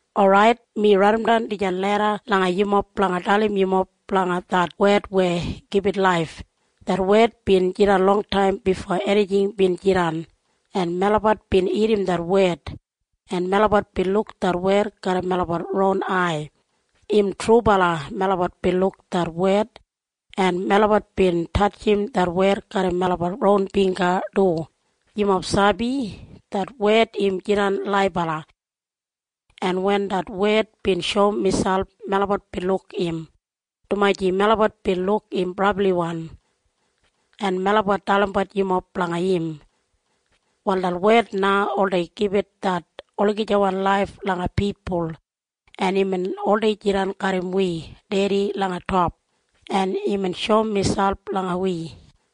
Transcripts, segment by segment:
Orait, mi raidimdan dijan leda langa yumob blanga dalim yumob blanga det Wed weya gibit laif. Det Wed bin jidan longtaim bifo enijing bin jidan. En melabat bin irrim det Wed, en melabat bin luk det Wed garram melabat ron ai. Im trubala melabat bin luk det Wed, en melabat bin tatjim det Wed garram melabat ron bingga du. Yumob sabi? Det Wed im jidan laibala. En wen det Wed bin shoum miselp, melabat bin luk im, dumaji melabat bin luk im brabliwan. En melabat dalimbat yumob blanga im. Wal det Wed na oldei gibit det olagijawan laif langa pipul, en imbin oldei jidan garram wi Dedi langa top, en imbin shoum miselp langa wi.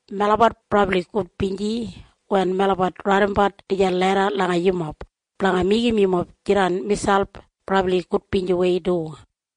Melabat brabli gudbinji wen melabat raidimbat dijan leda langa yumob, blanga meigim yumob jidan miselp brabli gudbinjiwei du.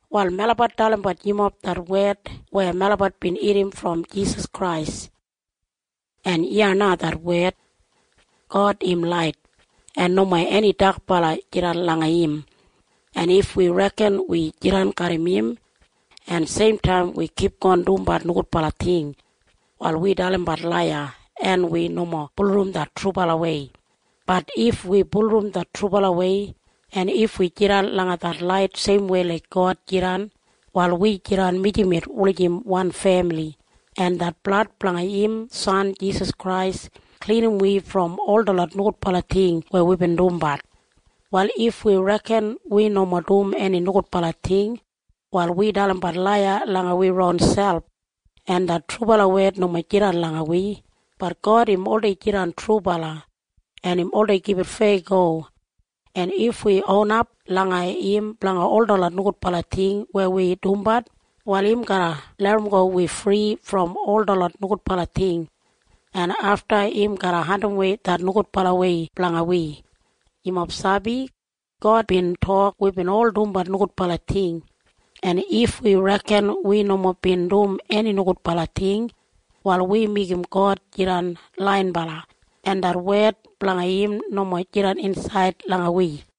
Wal melabat dalimbat yumob det wed weya melabat bin irrim brom Jisas Krais. En iya na det wed. God im lait, en nomo eni dakbala jidan langa im. En if wi reken wi jidan garram im, en seimtaim wi kipgon dumbat nogudbala ting, wal wi dalimbat laiya, en wi nomo bulurrum det trubalawei. Bat if wi bulurrum det trubalawei, en if wi jidan langa det lait seimwei laik God jidan, wal wi jidan mijamet wulijim wan femili, en det blad blanga im San Jisas Krais klinim wi brom ol detlot nogudbala ting weya wibin dumbat. Wal if wi reken wi nomo dum eni nogudbala ting, wal wi dalimbat laiya langa wi ronselp, en det trubala wed nomo jidan langa wi. Bat God im oldei jidan trubala, en im oldei gibit feyago, en if wi onap langa im blanga ol detlot nogudbala ting weya wi dumbat, wal im garra larramgo wi fri brom ol detlot nogudbala ting, en afta im garra andimwei det nogudbalawei blanga wi. Yumob sabi? God bin tok wibin ol dumbat nogudbala ting. En if wi reken wi nomo bin dum eni nogudbala ting, wal wi meigim God jidan laiyinbala, en det wed blanga im nomo jidan insaid langa wi.